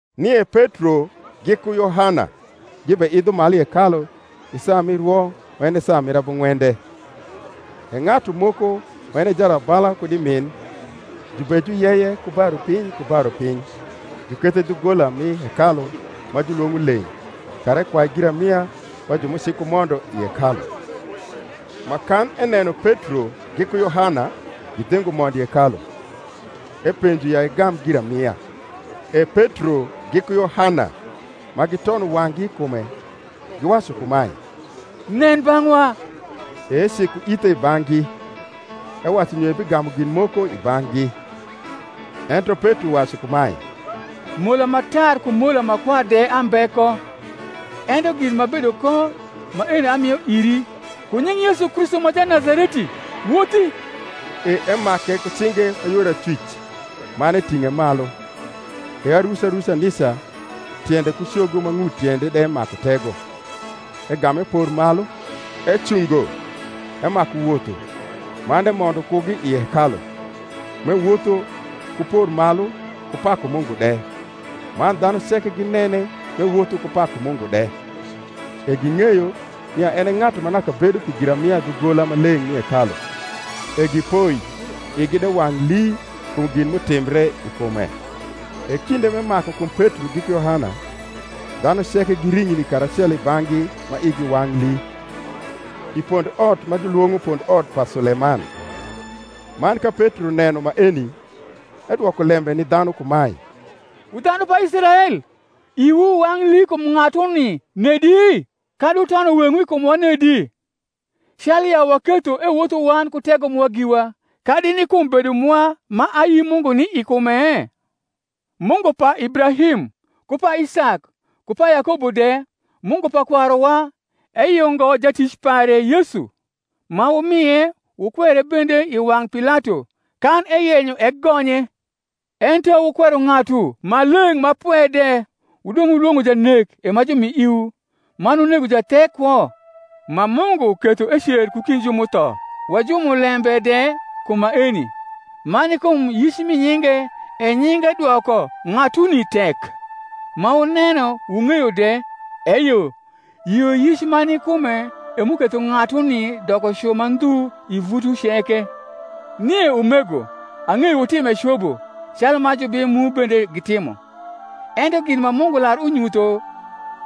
Nie Petro giku Yohana gibeidho malu i hekalu i saa mi rwo ma en e saa mir abung’wende. E ng’atu moko ma en e jarabala kud i min, jubejuyeye ku ba piny ku ba rupiny jukethe dhugola mi hekalu ma julwong’o Leng’ kara ekwai giramia ba ju m’ucikumondo i hekalu; ma kan eneno Petro giku Yohana gidhingo mondo i hekalu, epenjo ya egam giramia. E Petro giku Yohana, ma gitono wang’gi i kume, giwacu kumae, Nen bang’wa. E eciko ithe i bang’gi, ewacu nyo ebigamu gin moko i bang’gi. Ento Petro wacu kumae, Mola ma tar ku mola ma kwar de ambe ko; ento gin m’abedo ko, maeno amio iri. Ku nying Yesu Kristu ma Janazareti, wothi. E emake ku cinge ma yor acwic, man eting’e malu: e aruca ruca nica tiende ku cogo ma ng’ut tiende de maku tego. Egam epor malu, ecungo, emaku wotho; man emondo kugi i hekalu, m’ewotho, ku por malu, ku paku Mungu de. Man dhanu ceke ginene m’ewotho ku paku Mungu de: e ging’eyo, nia en e ng’atu ma naka bedo pi giramia Dhugola Maleng’ mi hekalu; e gipoi igi de wang’ lii kum gin m’utimbre i kume. E kinde m’emaku kum Petro giku Yohana, dhanu ceke giring’ni karacelo i bang’gi ma igi wang’ lii, i pondot ma julwong’o pondot pa Suleman. Man ka Petro neno maeni, edwoko lembe ni dhanu kumae, Wu dhanu pa Israel, iwu wang’ lii kum ng’atuni nedi? kadi wutono weng’wu i kumwa nedi, calu ya waketho ewotho wan ku tego mwa giwa kadi ni kum bedo mwa ma ayi Mungu ni i kume? Mungu pa Ibrahim, ku pa Isak, ku pa Yakobo de, Mungu pa kwaruwa, eyungo Jatic pare Yesu; ma wumie, wukwere bende i wang’ Pilato, kan eyenyo egonye. Ento wukwero Ng’atu Maleng’ ma Pwe de, wudong’ wulwong’o janek e ma jumi iwu, man wunego Jathek kwo; ma Mungu ketho ecer ku kind ju m’utho; wa jumulembe de kum maeni. Man ni kum yic mi nyinge e nyinge dwoko ng’atuni tek, ma wuneno wung’eyo de: eyo, yioyic ma ni kume e m’uketho ng’atuni doko cu ma ndhu i vutwu ceke. Nie, umego, ang’eyo wutime cobo, calu ma jubim mu bende gitimo. Ento gin ma Mungu lar unyutho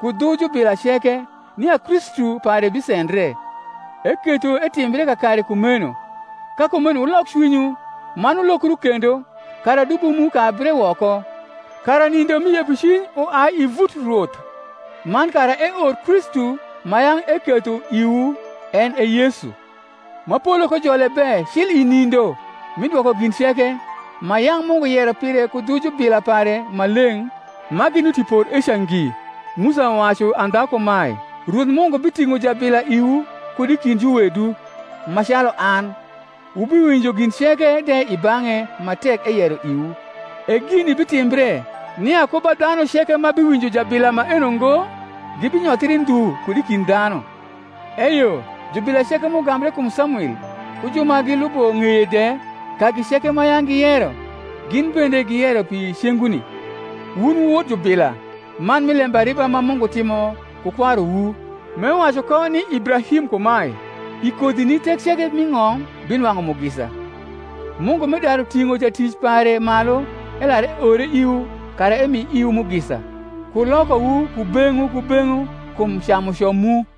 ku dhu jubila ceke, nia Kristu pare bisendre, eketho etimbre kakare kumeno. Ka kumeno wulok cwinywu, man wulokru kendo, kara dubo mu kabre woko, kara nindo mi yepocwiny uai i vut Rwoth; man kara eor Kristu ma yang’ eketho iwu, en e Yesu: ma polo kojole be cil i nindo mi dwoko gin ceke, ma yang’ Mungu yero pire ku dhu jubila pare maleng’ ma ginuti por eca ngi. Musa wacu andha kumae, Rwoth Mungu biting’o jabila iwu kud i kind juwedu, ma calu an; wubiwinjo gin ceke de i bang’e ma tek eyero iwu. E gini bitimbre, nia ku ba dhanu ceke ma biwinjo jabila maeno ngo, gibinyothri ndhu kud i kind dhanu. Eyo jubila ceke m’ugambre kum Samwil ku ju ma gliubo ng’eye de, kagi ceke ma yang’ giyero, gin bende giyero pi cenguni. Wun wu wot jubila, man mi lembariba ma Mungu timo ku kwaruwu, m’ewacu ko ni Ibrahim kumae, I kodhini thek ceke m’i ng’om binwang’u mugisa. Mungu m’edaru ting’o Jatic pare malu, elar eore iwu kara emi iwu mugisa, ku lokowu kubeng’wu kubeng’wu kum camuco mu.